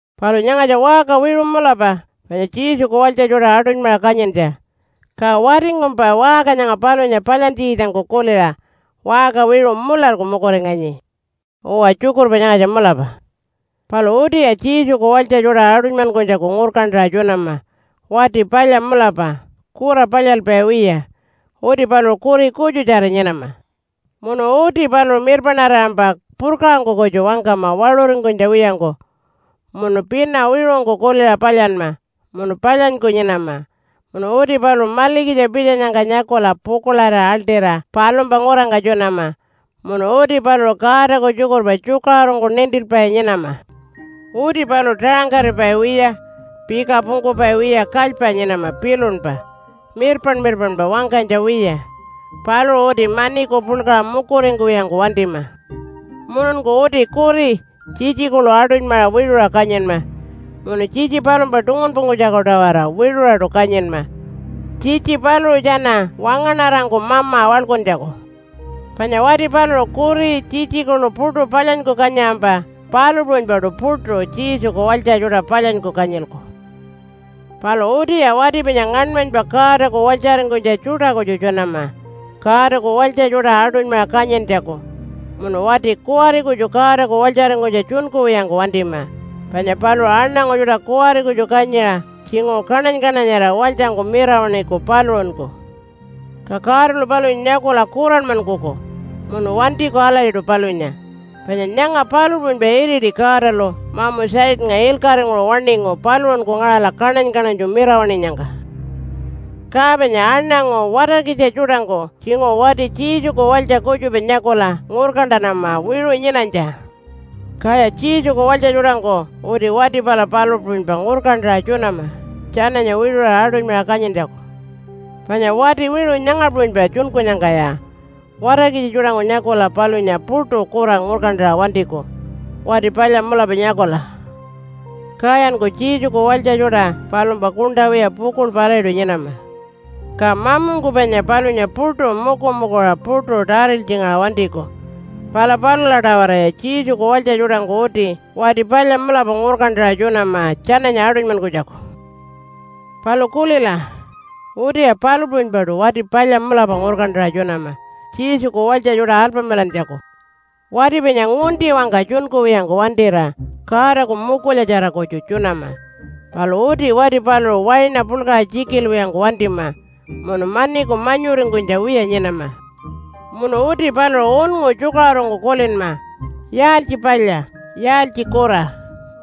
Palu nyangatja waṟka wiṟu mulapa panya Jesuku walytja tjuṯa aṯunymaṟa kanyintja. Ka watingkumpa waṟka nyanga palunya palyantjikitjangku kuliṟa waṟka wiṟu mularku mukuringanyi. Uwa, tjukurpa nyangatja mulapa. Palu utiya Jesuku walytja tjuṯa aṯunymankunytjaku ngurkantaṟa tjunama wati palya mulapa kura palyalpai wiya. Uti paluṟu kuri kutjutjara nyinama. Munu uti paluṟu mirpaṉarirampa purkaṟangku kutju wangkama waṟuringkunytja wiyangku, munu pina wiṟungku kuliṟa palyanma, munu palyanyku nyinama. Munu uti paluṟu malikitja pitjanyangka nyakula pukuḻarira aḻṯira palumpa ngurangka tjunama. Munu uti paluṟu Godaku tjukurpa tjukaṟurungku nintilpai nyinama. Uti paluṟu taṟangkaripai wiya, pika pungkupai wiya kalypa nyinama pilunpa, mirpaṉ-mirpaṉpa wangkanytja wiya. Paluṟu uti maniku puḻkaṟa mukuringkuwiyangku wantima. Mununku uti kuri, tjitji kuḻu aṯunymaṟa wiṟuṟa kanyinma, munu tjitji palumpa tungunpungkunytjaku-tawara wiṟuṟaṯu kanyinma, tjitji paluṟu tjana wangaṉarangku mama waḻkuntjaku. Panya wati paluṟu kuri, tjitji kuḻu puṯu palyanyku kanyiṟampa palu puṟunypaṯu puṯu Jesuku walytja tjuṯa palyanyku kanyilku. Palu utiya wati panya ngaṉmanypa Godaku walytjaringkunytja tjuṯa kutju tjunama Godaku walytja tjuṯa aṯunymaṟa kanyintjaku. Munu wati kuwari kutju Godaku walytjaringkunytja tjunkuwiyangku wantima, panya paluṟu aṉangu tjuṯa kuwari kutju kanyiṟa tjinguṟu kaṉany-kaṉanyarira walytjangku mirawaṉiku paluṟunku. Ka Godalu palunya nyakula kuranmankuku munu wantiku alatjiṯu palunya. Panya nyanga palu puṟunypa iriti Godalu mamu Satannga ilkaṟinguṟu waṉingu paluṟunku ngaṟala kaṉany-kaṉanytju mirawaṉinyangka. Ka panya aṉangu watarkitja tjuṯangku tjinguṟu wati Jesuku walytja kutjupa nyakula ngurkantanama wiṟu nyinanytja. Kaya Jesuku walytja tjuṯangku uti wati pala palu puṟunypa ngurkantaṟa tjunama tjananya wiṟuṟa aṯunymaṟa kanyintjaku. Panya wati wiṟu nyanga puṟunypa tjunkunyangkaya watarkitja tjuṯangku nyakula palunya puṯu kura ngurkantaṟa wantiku wati palya mulapa nyakula. Kayanku Jesuku walytja tjuṯa palumpa kuṉṯa wiya pukuḻpa alatjiṯu nyinama. Ka mamungku panya palunya puṯu mukumukuṟa puṯu tariltjingaṟa wantiku. Pala palula-tawaraya Jesuku walytja tjuṯangku uti wati palya mulapa ngurkantaṟa tjunama tjananya aṯunymankunytjaku. Palu kulila! Utiya palu puṟunypaṯu wati palya mulapa ngurkantaṟa tjunama Jesuku walytja tjuṯa alpamilantjaku. Wati panya ngunti-wangka tjunkuwiyangku wantira Godaku mukulyatjara kutju tjunama. Palu uti wati paluṟu waina puḻkaṟa tjikilwiyangku wantima munu maniku manyuringkunytja wiya nyinama. Munu uti paluṟu unngu tjukaṟurungku kulinma yaaltji palya, yaaltji kura,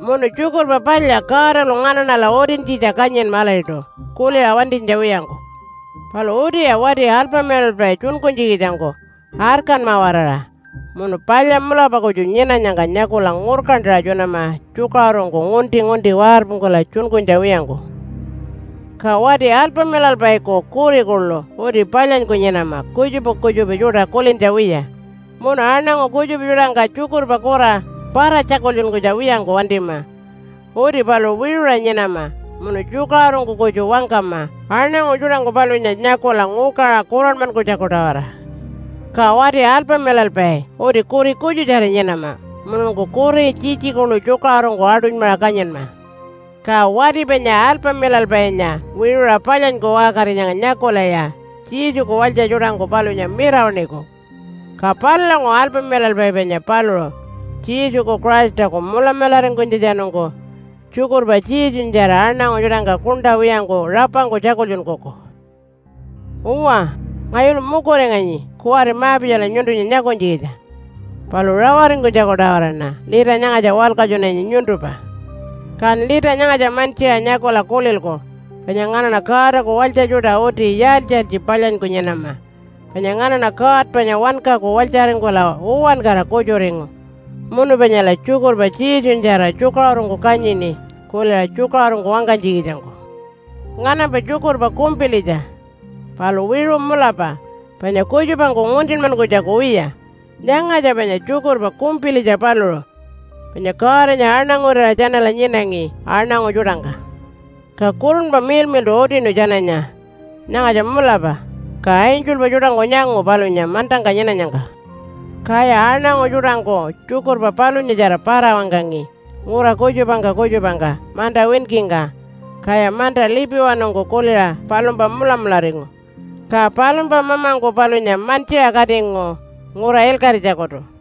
munu Tjukurpa Palya Godalu nganaṉala utintjitja kanyinma alatjiṯu kuliṟa wantinytja wiyangku. Palu utiya wati alpamilalpai tjunkunytjikitjangku arkanma-waraṟa munu palya mulapa kutju nyinanyangka nyakula ngurkantaṟa tjunama tjukaṟurungku, ngunti-ngunti warpungkula tjunkunytja wiyangku. Ka wati alpamilalpaiku kuri kuḻu uti palyanyku nyinama kutjupa kutjupa tjuṯa kulintja wiya, munu aṉangu kutjupa tjuṯangka tjukurpa kura para-tjakultjunkuwiyangku wantima. Uti paluṟu wiṟuṟa nyinama munu tjukaṟurungku kutju wangkama aṉangu tjuṯangku palunya nyakula ngukaṟa kuranmankunytjaku-tawara. Ka wati alpamilalpai uti kuri kutjutjara nyinama mununku kuri, tjitji kuḻu tjukaṟurungku aṯunymaṟa kanyinma. Ka wati panya alpamilalpainya wiṟuṟa palyanyku waṟkarinyangka nyakulaya Jesuku walytja tjuṯangku palunya mirawaṉiku. Ka palulanguṟu alpamilalpai panya paluṟu Jesuku Christaku mulamularingkunytjatjanungku tjukurpa Jesunyatjara aṉangu tjuṯangka kuṉṯa wiyangku rapangku tjakultjunkuku. Uwa, ngayulu mukuringanyi kuwari ma-pitjala nyuntunya nyakunytjikitja. Palu rawaringkunytjaku-tawaraṉa lita nyangatja walkatjunanyi nyuntumpa. Kan lita nyangatja mantjiṟa nyakula kulilku panya nganaṉa Godaku walytja tjuṯa uti yaaltji-yaaltji palyanyku nyinama. Panya nganaṉa God panya wankaku walytjaringkula uwankara kutjuringu, munu panyala tjukurpa Jesunyatjara tjukaṟurungku kanyini kuliṟa tjukaṟurungku wangkanytjikitjangku. Nganampa tjukurpa kumpilitja, palu wiṟu mulapa panya kutjupangku nguntinmankunytjaku wiya. Nyangatja panya tjukurpa kumpilitja paluṟu, Panya Godanya aṉangurira tjanala nyinangi aṉangu tjuṯangka. Ka Kurunpa Miḻmiḻṯu utinu tjananya, “Nyangatja mulapa.” Ka angelpa tjuṯangku nyangu palunya mantangka nyinanyangka. Kaya aṉangu tjuṯangku tjukurpa palunyatjara para-wangkangi ngura kutjupangka kutjupangka manta winkingka. Kaya manta lipiwanungku kuliṟa palumpa mulamularingu. Ka palumpa mamangku palunya mantjiṟa katingu ngura ilkaṟitjakutu.